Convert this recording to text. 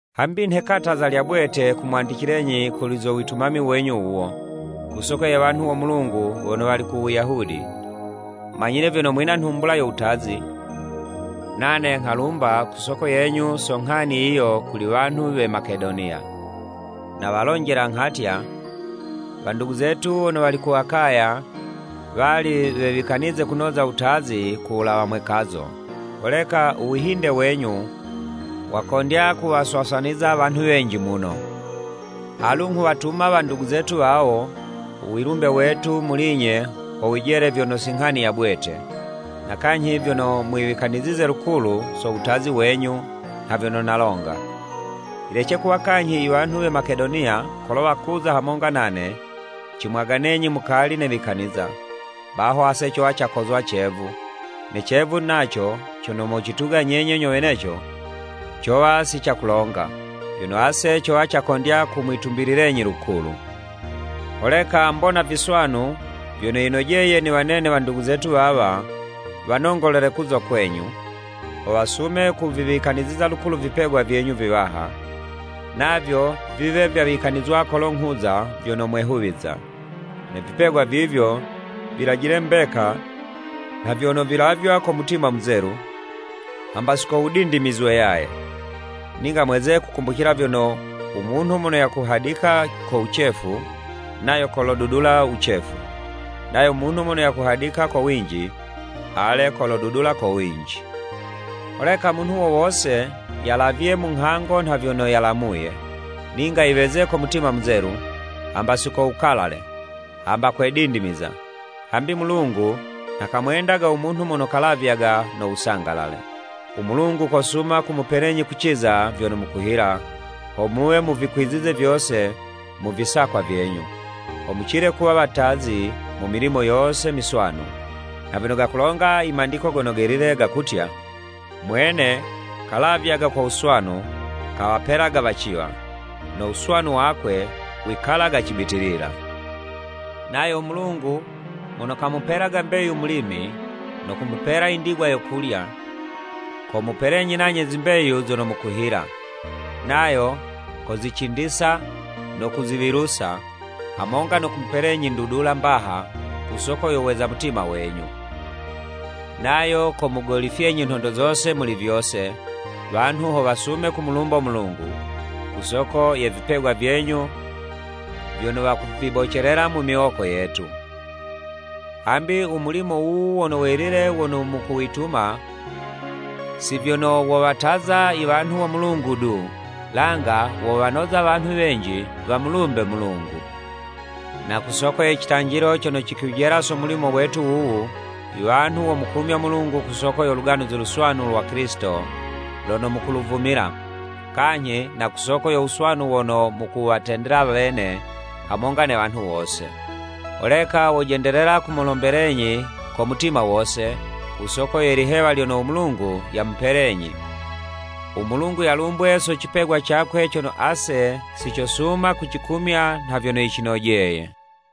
Hambi nhe kataza lya bwete kumwandicilenyi kuli zo witumami wenyu wuwo, ku soko ye wanhu wo Mulungu wono wali ku Wuyahudi. Manyile vyono mwina nhumbula yo wutazi, nane nghalumba ku soko yenyu so nghani yiyo kuli wanhu we Makedoniya. Nawalonjela nghatya, “Wandugu zetu wono wali ku Akaya, wali wewikanize kunoza wutazi ku wulawa mwekazo.” Holeka u wihinde wenyu, wakondya kuwaswaswaniza wanhu wenji muno. Alu nghuwatuma wandugu zetu wawo, u wilumbe wetu wa muli'nye, ho wijele vyono si nghani ya bwete, na kanyhi vyono mwiwikanizize lukulu so wutazi wenyu nha vyono nalonga. Yilece kuwa kanyhi i wanhu we Makedoniya kolo wakuza hamonga nane, cimwaganenyi mukali newikaniza, baho ase cowa cakozwa cevu, ne cevu naco cono mocituga nyenye nyo weneco, cowa si cakulonga, vyono ase cowa cakondya kumwitumbililenyi lukulu. Holeka mbona viswanu vyono yinojeye niwanene wandugu zetu wawa, wanongolele kuza kwenyu, ho wasume kuviwikaniziza lukulu vipegwa vyenyu viwaha, navyo viwe vyawikanizwa kolo nghuza, vyono mwehuwiza. Ne vipegwa vivyo, vilajile mbeka, nha vyono vilavywa ko mutima muzelu, hamba si ko wudindimizwe yaye. Ninga mweze kukumbucila vyono, “U munhu mono yakuhadika ko wucefu, nayo kolo dudula wucefu, nayo munhu mono yakuhadika ko winji, ale, kolodudula ko winji.” Holeka munhu wo wose yalavye mu nghango nha vyono yalamuye, ninga yiweze ko mutima muzelu, hamba si ko wukalale, hamba kwe dindimiza, hambi u Mulungu, nha kamwendaga u munhu mono kalavyaga no wusangalale. U Mulungu kosuma kumupelenyi kuciza vyono mukuhila, ho muwe muvikwizize vyose mu visakwa vyenyu, ho mucile kuwa watazi mu milimo yose miswanu, nha vyono gakulonga i Mandiko Gono Gelile, gakutya, “Mwene kalavyaga ko wuswanu kawapelaga waciwa, no wuswanu wakwe wikalaga cibitilila.” Nayo u Mulungu mono kamupelaga mbeyu mulimi, no kumupela i ndigwa yo kulya, komupelenyi nanye zimbeyu zono mukuhila, nayo kozicindisa no kuziwilusa, hamonga no kumupelenyi ndudula mbaha ku soko yo weza mutima wenyu. Nayo komugolifyenyi nhondo zose muli vyose, wanhu ho wasume kumulumbo Mulungu, ku soko ye vipegwa vyenyu vyono wakuvibocelela mu miwoko yetu. Hambi u mulimo wuwu wono welile wono mukuwituma, si vyono wowataza i wanhu wo Mulungu du, langa wowanoza wanhu wenji wamulumbe Mulungu. Na ku soko ye citanjilo cono cikwijela so mulimo wetu wuwu, i wanhu womukumyo Mulungu ku soko yo Luganuzi Luswanu lwa Kilisito lono mukuluvumila, kanyhi na ku soko yo wuswanu wono mukuwatendela wene hamonga ne wanhu wose. Holeka wojendelela kumulombelenyi ko mutima wose, ku soko ye lihewa lyono u Mulungu yamupelenyi. U Mulungu yalumbwe so cipegwa cakwe cono ase si cosuma kucikumya nha vyono yicinojeye.